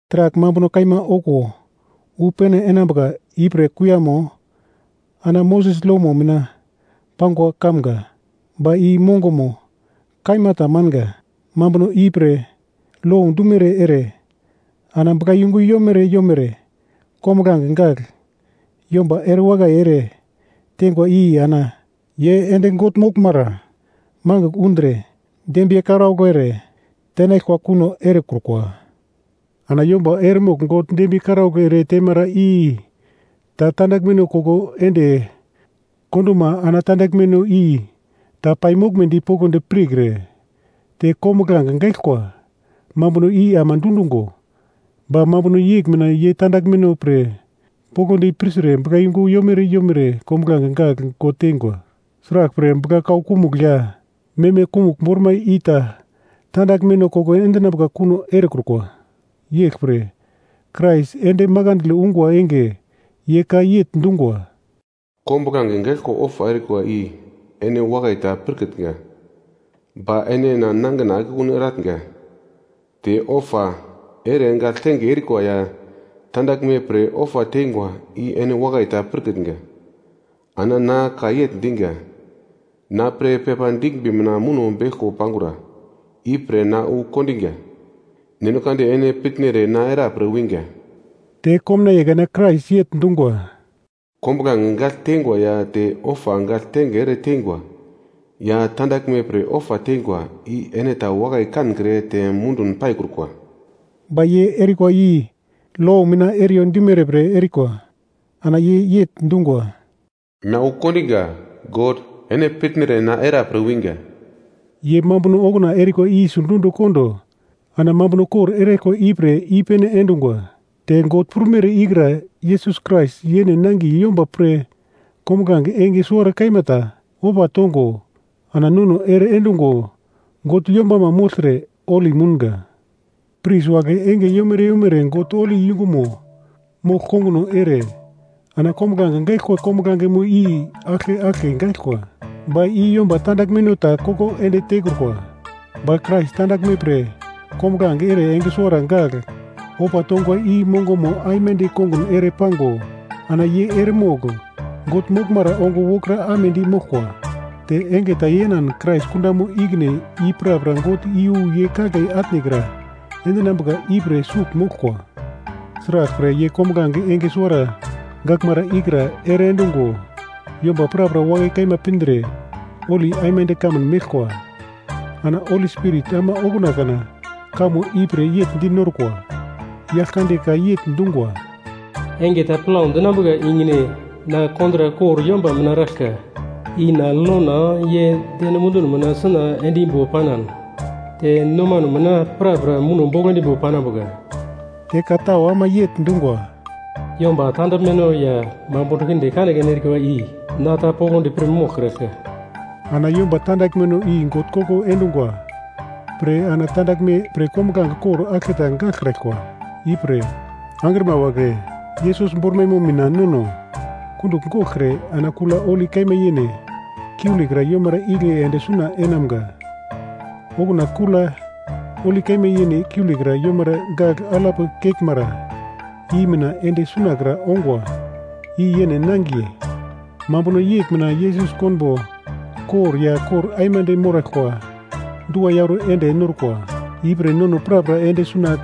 Taragl mambuno kaima okuwo wu pene enambuka ipre kuiyamo ana Moses lomo mina pangwa kamga, ba i mongomo kaima tamanga. Mambuno ipre lo dumere ere ana buglayungu yomere yomere kombuglange gagl yomba erewakai ere tengwa i ana ye ende God moglmara magl undre dembiye karaugl ere tenaglkwa kuno erekrukwa. Ana yomba eremogl God dembiye karaugl ere temara i ta tandaglmeno koko ende konduma ana tandaglmeno i ta paimoglmedi poglodi pirkre, te kombuglange gaglkwa mambuno i ama dundungo. Ba mambuno yegl mina ye tandaglmeno pre poglodi pirtre buglayungu yomere yomere kombuglange gagl God teingwa. Sraglpre, bugla-kau kumugl ya meme kumugl bormaino i ta tandaglmeno koko endinambuka kuno erekrukwa. Yeglpre, Krais ende makandle ungwa enge, ye ka yegl dungwa: “Kombuglange gagl ofa erikwa i ene wakai ta pirkitnga, ba ene na nangina akekun erenatnga; te ofa ere gagltenge erikwa ya tandaglme pre ofa teingwa i ene wakai ta pirkitnga. Ana na ka yegl diga, ‘Na pre pepa diglmbi mina muno beglko pangura. Ipre na wu kondiga God, ene pitnere na era pre winga.’” Te komnaiye kana Krais yegl dungwa, “Kombuglange gagl teingwa ya te ofa gagltenge ere teingwa ya tandaglme pre ofa teingwa i ene ta wakai kankre te mundun paikrukwa.” (Ba ye erikwa i lo mina eriyo dimere pre erikwa.) Ana ye yegl dungwa, “Na wu kondiga God, ene pitnere na era pre winga.” Ye mambuno okuna erikwa i sidundi kondo ana mambuno kor eraglkwa ipre i-pene endungwa. Te God prumere ikra Yesus Krais yene nangiye yomba pre kombuglange enge suwara kaima ta ofa tongo ana nono ere endungo God yombama mogltre holi mounga. Pris wagle enge yomere yomere God holi yungumo mogl konguno ere ana kombuglange gaglkwa kombuglangemo i aglke aglke gaglkwa, ba i yomba tandaglmeno ta koko ende tekrukwa. Ba Krais tandaglme pre kombuglange enge suwara gagl ofa tongwa i mongomo aimande kongun ere pango ana ye eremogl God moglmara ongo wokra amedi moglkwa, te enge ta yenan Krais kundamo ikine i prapra God iyu ye kagle atnekra endinambuka ipre sugl moglkwa. Sraglpre ye kombuglange enge suwara gaglmara ikra ere endungo yomba prapra wakai kaima pindre holi aimande kamun meglkwa. Ana Holi Spirit ama okuna kana kamo ipre yegl dinorkwa: Yaglkande ka yegl dungwa, “Enge ta plau dinambuka ikine na kontrak kor yomba mina eraglka, i na lona ye deno munduno mina suna endimbo panan te nomano mina prapra muno bogl endimbo panambuka.” Te ka tau ama yegl dungwa, “Yomba tandaglmeno ya mambuno kinde kanekane erikwa i na ta poglodi pir moglkraglka.” Ana yomba tandaglmeno i God koko endungwa pre ana tandaglme pre kombuglange kor aglketa gaglkraglkwa. Ipre, angrima wagle, Yesus bormaimo mina nono kundugl goglkre ana Kula Holi Kaima Yene kiulekra yomara igle ende suna enamga, okuna Kula Holi Kaima Yene kiulekra yomara gagl alap keglmara i mina ende sunakra ongwa i yene nangiye. Mambuno yegl mina Yesus konbo kor ya kor aimande moraglkwa dua yauro ende norkwa, ipre nono prapra ende suna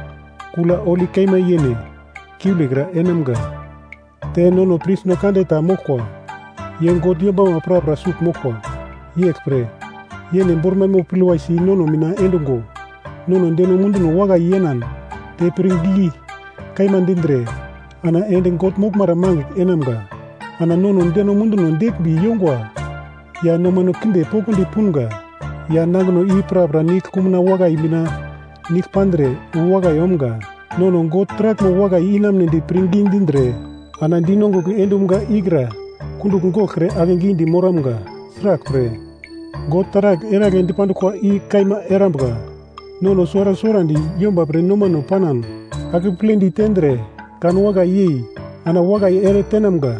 Kula Holi Kaima Yene kiulekra enamga, te nono prisno kande ta moglkwa, ye God yombama prapra sugl moglkwa, yeglpre, yene bormaimo pilwai si nono mina endungo nono deno munduno wakai yenan te pirngi kaima dindre ana ende God moglmara magl enamga. Ana nono deno munduno deglmbi yongwa ya nomano kinde poglodi punga ya nangino i prapra nigl kumuna wakai mina nigl pandre wu wakai omga. Nono God taraglmo wakai inamunedi pirngi dindre ana dinongugl endumga ikra kundugl goglkre akegidi moramga, sraglpre, God taragl eragle dipanduglkwa i kaima erambuka. Nono suwara suwarandi yomba pre nomano panan, akepledi tendre, kan wakai yei ana wakai ere tenamga.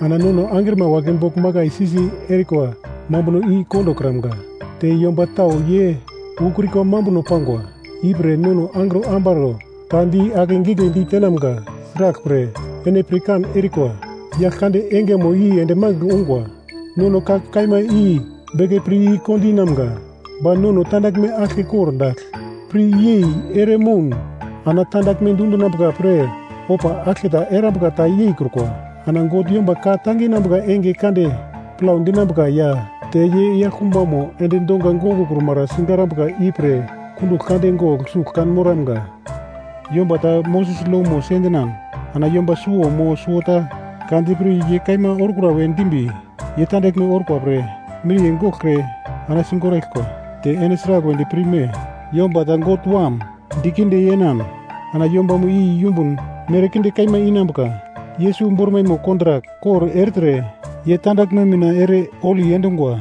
Ana nono angrima wagle bogl makai si-si erikwa i kondokramga, te yomba tau ye ukrikwa mambuno pangwa. Ipre nono angro ambaro ta di ake gigle ditenamga, sraglpre ene pirkan erikwa, Yaglkande Engemo i ende magl ungwa. Nono ka kaima i beke pir i-kondinamga, ba nono tandaglme aglke kordagl pir yei ere moun, ana tandaglme dundinambuka pre ofa aglketa erambuka ta yeikrukwa. Ana God yomba ka tanginambuka enge kande plau dinambuka ya te ye yaglkumbamo endi donga gongokrumara sigarambuka ipre kundugl kande gogl sugl kan moramga. Yomba ta Moses lomo sendinan ana yomba suwo mo suwota ka dipir ye kaima orkura we dimbi, ye tandaglme orkwa pre miriye goglkre ana sigoraglkwa. Te ene sragl wedi pirme, yomba ta God Wam dikinde yenan ana yombamo i yumbun mere kinde kaima inambuka. Yesus bormaimo kontrak kor ertre ye tandaglme mina ere holi endungwa,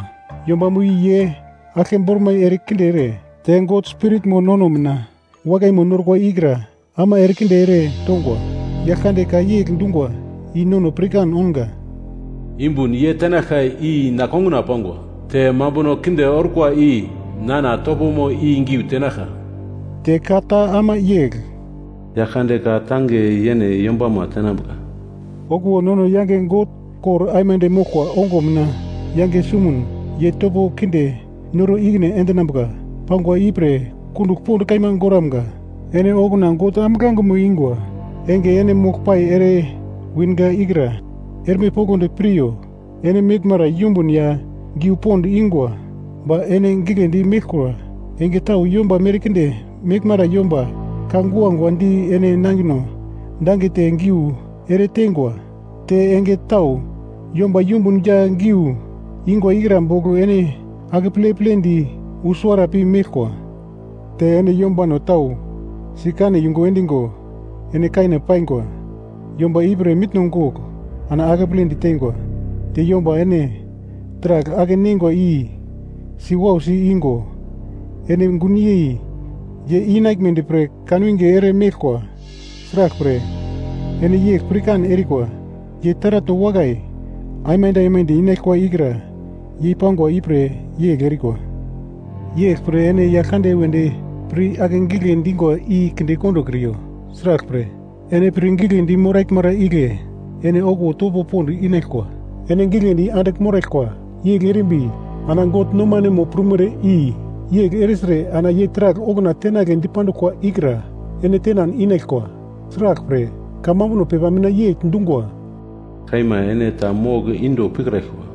yombamo i ye aglke bormai erekinde ere, te God Spiritmo nono mina wakaimo norkwa ikra ama erekinde ere tongwa. Yaglkande ka yegl dungwa i nono pirkan ounga, “Yumbun ye tenaglka i na konguna pangwa; te mambuno kinde orkwa i nana topomo i giu tenaglka.” Te ka ta ama yegl, “Yaglkande ka tange yene yombama tenambuka.” Okuwo nono yange God kor aimande moglkwa ongo mina yange sumun ye topo kinde noro ikine endinambuka pangwa ipre kundugl pond kaima goramga. Ene okuna God ambuglangemo ingwa enge ene mogl pai ere winga ikra erme poglodi piryo, ene meglmara yumbun ya giu pond ingwa, ba ene giglendi meglkura. Enge tau yomba merkinde meglmara yomba ka guagua di ene nangino dangete giu ere tengwa. Te enge tau yomba yumbun ya giu ingwa ikra bogl ene akeple-pledi wu suwara pi meglkwa. Te ene yombano tau sikane yungu endigo ene kane paingwa yomba i pre mitno gogl ana akeple ditengwa. Te yomba ene taragl ake-neingwa i si wausi igo, ene gunyei ye inaglmedi pre kanwinge ere meglkwa, sraglpre, ene yegl pirkan erikwa ya taratno wakai aimande aimande inaglkwa ikra yei pangwa ipre yegl erikwa. Yeglpre ene Yaglkande wedi pir ake gigle dingwa i kinde kondokriyo, sraglpre, ene pir giglendi moraglmara igle ene okuwo topo pond inaglkwa. Ene giglendi andigl moraglkwa, yegl erimbi, ana God nomanemo prumere i yegl ertre ana ye taragl okuna tenagle dipanduglkwa ikra ene tenan inaglkwa. Sraglpre kamambuno pepa mina yegl dungwa: “Kaima ene ta mogl inde pikraglkwa.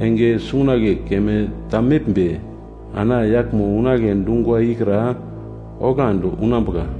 Enge sungagle keme ta meglmbi, ana yaglmo unagle dungwa ikra oglandi unambuka,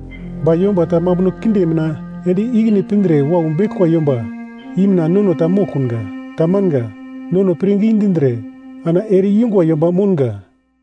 Ba yomba ta mambuno kinde mina ende ikine pindre wau beglkwa yomba i mina nono ta moglkunga. Tamanga. Nono pirngi dindre ana ere-ingwa yomba mounga.